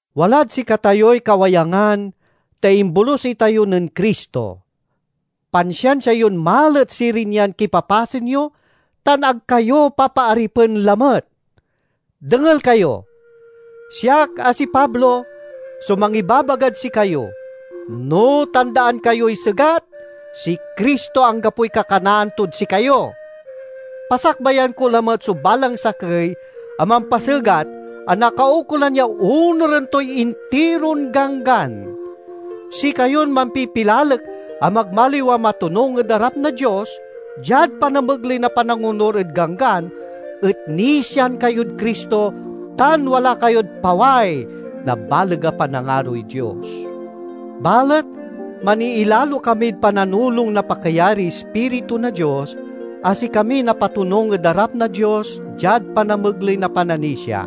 Walad sikatayoy kawayangan, ta imbolus itayo nen Cristo! Pansiansia yon malet sirin yan kipapasen yo, tan ag kayo papaaripen lamet. Dengel kayo! Siak, a si Pablo, so mangibabagad sikayo: no tandaan kayoy segat, si Cristo anggapoy kakanaan tod sikayo. Pasakbayan ko lamet so balang sakey a mampasegat a nakaukolan ya onuren toy intiron Ganggan. Sikayon mampipilalek a magmaliw a matonung ed arap na Dios diad panamegley na panangonur ed Ganggan et nisian kayod Cristo tan wala kayod paway na baleg a panangaroy Dios. Balet maniilalo kamid pananulong na pakayariy Ispiritu na Dios, a sikamiy napatonung ed arap na Dios diad panamegley na pananisia.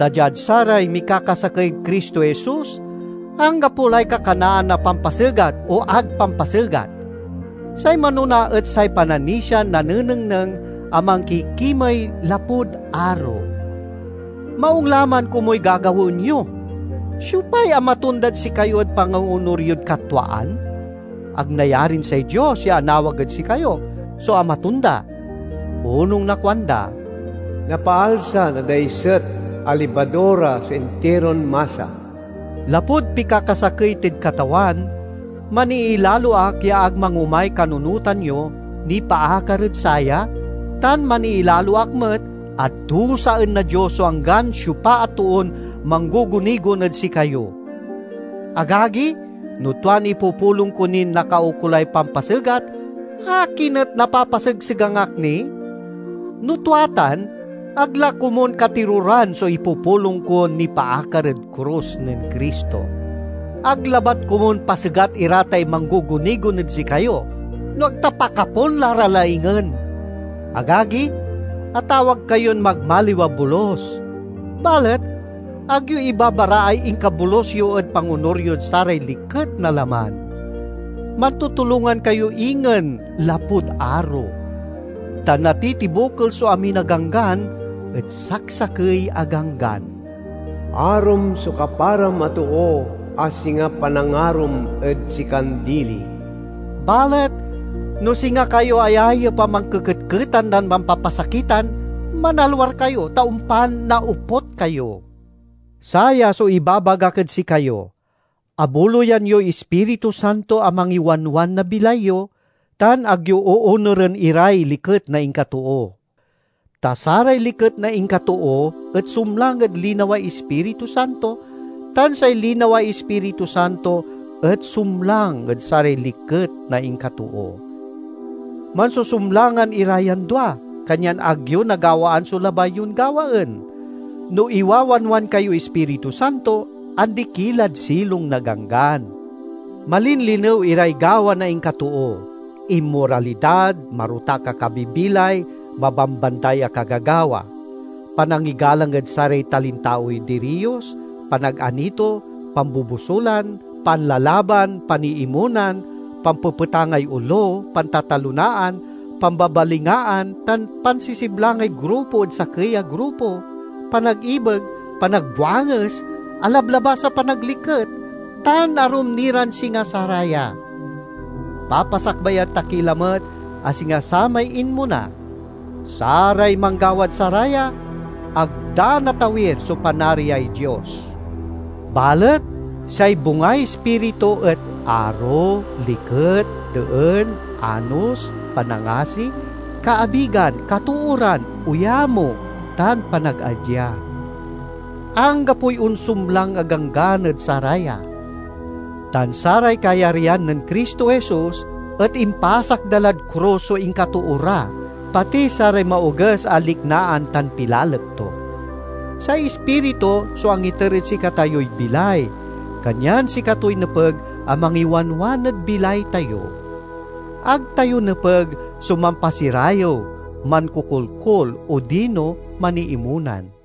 Ta diad saray mikakasakey ed Cristo Jesus, anggapo lay kakanaan na pampasegat o ag pampasegat. Say manona et say pananisian nanengneng a mankikimey lapud aro. Maung la man komuy gagawaen yo! Siopay amatondad sikayo ed pangoonur yod katwaan? Ag nayarin say Dios ya anawag ed sikayo so amatonda. Onung na kuanda, "Napaalsa na daiset a libadura so intiron masa." Lapud pikakasakey tid Katawan, maniilalo ak ya ag mangomay kanunotan yo nipaakar ed saya, tan maniilalo ak met a dusaen na Dios so anggan siopa a toon manggugunigon ed sikayo. Agagi, no tuan ipupulong ko nin nakaukolay pampasegat, akin et napapasegsegang ak ni? No tua tan, ag la komun katiroran so ipupulong kon nipaakar ed krus nen Cristo. Ag labat komun pasegat ira tay manggugunigon ed sikayo, no ag ta pakapun la ra laingen. Agagi, atawag kayon magmaliw a bolus. Balet ag yo ibabaraay inkabolus yo ed pangonur yod saray liket na laman. Mantutulongan kayo ingen lapud aro. Ta natitibokel so amin a Ganggan ed saksakey a ganggan: "Arom so kaparam a too a singa panangarom ed sikan dili." Balet no singa kayo ayayep a mankeketketan tan mampapasakitan, manalwar kayo ta ompan naoput kayo. Saya so ibabagak ed sikayo: abuloyan yoy Ispiritu Santo a mangiwanwan na bilay yo, tan ag yo oonuren iray liket na inkatoo. Ta saray liket na inkatoo et sumlang ed linaway Ispiritu Santo tan say linaway Ispiritu Santo et sumlang ed saray liket na inkatoo. Mansusumlangan ira yan dua, kanyan ag yo nagawaan so labay yon gawaen. No iwawanwan kayoy Ispiritu Santo, andi ki lad silong na Ganggan. Malinlinew iray gawa na inkatoo: inmoralidad, marotak a kabibilay, mabambanday a kagagawa; panangigalang ed saray talintaoy diriyos, panaganito, pambobosulan, panlalaban, paniimonan, pampepetangay olo, pantatalonaan, pambabalingaan tan pansisiblangay grupo ed sakey a grupo, panagibeg, panagbuanges, alablabas a panagliket, tan arum ni ran singa saraya. Papasakbayan ta ki lamet a singa samay inmona: saray manggawad saraya, ag da natawir so Panariay Dios. Balet say bungay Ispiritu et aro, liket, deen, anos, panangasi, kaabigan, katooran, oyamo, tan panagadya. Anggapoy onsumlang a ganggan ed saraya. Tan saray kayaryan nen Cristo Jesus et impasak da lad krus so inkatoo ra, pati saray maoges a liknaan tan pilalek to. Say Ispiritu so angiter ed sikatayoy bilay, kanyan sikatoy nepeg a mangiwanwan ed bilay tayo. Ag tayo nepeg so mampasirayew, mankokolkol, odino maniimonan.